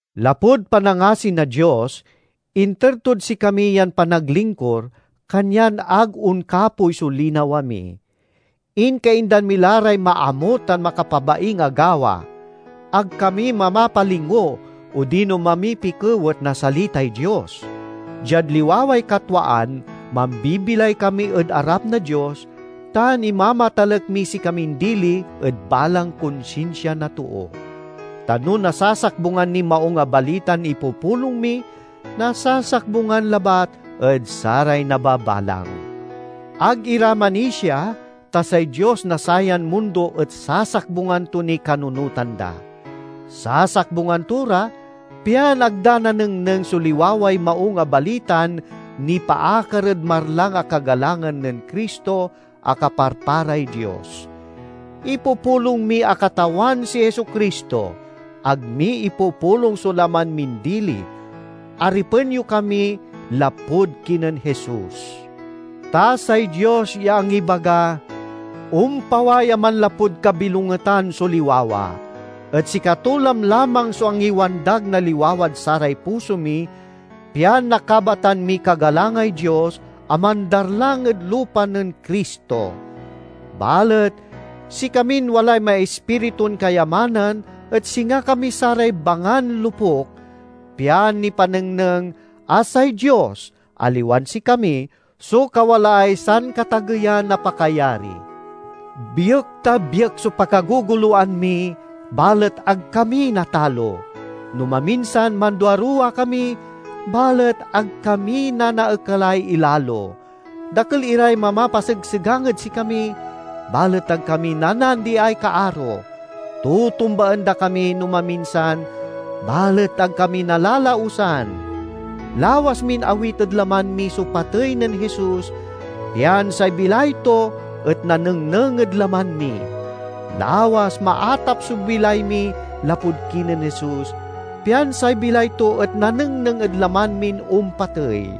Lapud panangasi na Dios, inter tod sikami yan panaglingkur, kanyan ag onkapoy so linawa mi. Inkaindan mi la ray maamut tan makapabaing a gawa. Ag kami mamapalingo odino mamipikewet na salitay Dios. Diad liwaway katwaan, mambibilay kami ed arap na Dios, tan imamatalek miy sikamin dili ed balang konsinsia na too. Ta no nasasakbungan niy Maung a Balitan ipupulong mi, nasasakbungan labat ed saray nababalang. Ag ira manisia ta say dios na sayan mundo et sasakbungan to niy kanununotan da. Sasakbungan to ra, pian ag da nanengneng so liwaway Maung a Balitan nipaakar ed marlang a kagalangan nen Cristo a kaparparay Dios. Ipupulong mi a Katawan si Jesu-Cristo; ag mi ipupulong so laman min dili. Aripen yo kami lapud kinen Jesus. Ta say Dios ya angibaga, "Ompaway a manlapud kabilongetan so liwawa!" et sikato lamlamang so angiwandag na liwawad saray puso mi, pian nakabatan miy kagalangay Dios a mandarlang ed lupa nen Cristo. Balet sikamin walay maispiritun kayamanan et singa kami saray bangan lopuk, pian nipanengneng a say Dios, aliwan sikami, so kawalaay sankatageyan a pakayari. Biek-ta-biek so pakagogoloan mi, balet ag kami natalo; no maminsan manduaruwa kami, balet ag kami nanaekalay ilalo. Dakel iray mamapasegsegang ed sikami, balet ag kami nanaandiay kaaro; tutumbaen da kami no maminsan, balet ag kami nalalausan. Lawas min awit ed laman mi so patey nen Jesus, pian say bilay to et nanengneng ed laman mi. Lawas maatap so bilay mi lapud kinen Jesus, pian say bilay to et nanengneng ed laman min ompatey.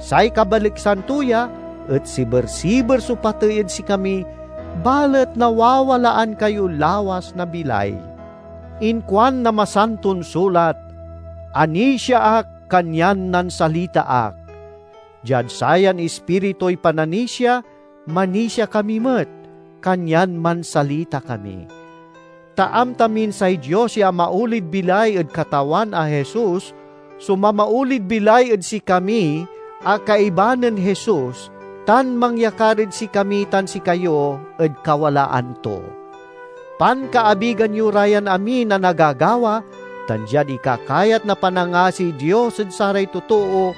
Say kabaliksan to ya et siber-siber so patey ed sikami, balet nawawalaan kayo lawas na bilay. Inkuan na Masanton Sulat, "Anisia ak, kanyan nansalita ak." Diad sayan ispirituy pananisia manisia kami met, kanyan mansalita kami. Ta amta min say Dios ya amaolid bilay ed Katawan a Jesus so mamaolid bilay ed sikami a kaiba nen Jesus, tan mangyakar ed sikami tan sikayo ed kawalaan to. Pankaabigan yo ra yan amin a nagagawa, tan diad ikakayat na panangasiy Dios ed saray totoo,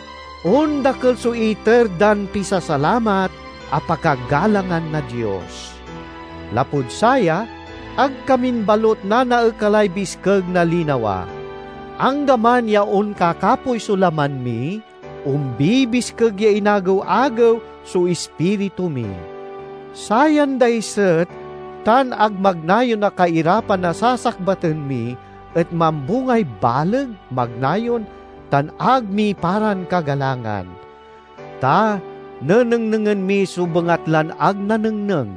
ondakel so iter dan pisasalamat a pakagalangan na Dios. Lapud saya, ag kamin balut nanaekalay biskeg na linawa. Anggaman ya onkakapoy so laman mi, ombibiskeg ya inagew-agew so ispiritu mi. Sayan daiset tan ag magnayon a kairapan a sasakbaten mi et mambungay baleg, magnayon, tan ag miparan kagalangan. Ta nenengnengen mi so bengatlan ag nanengneng,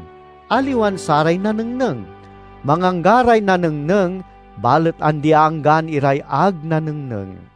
aliwan saray nanengneng; mangangga ray nanengneng, balet andi-anggaan iray ag nanengneng.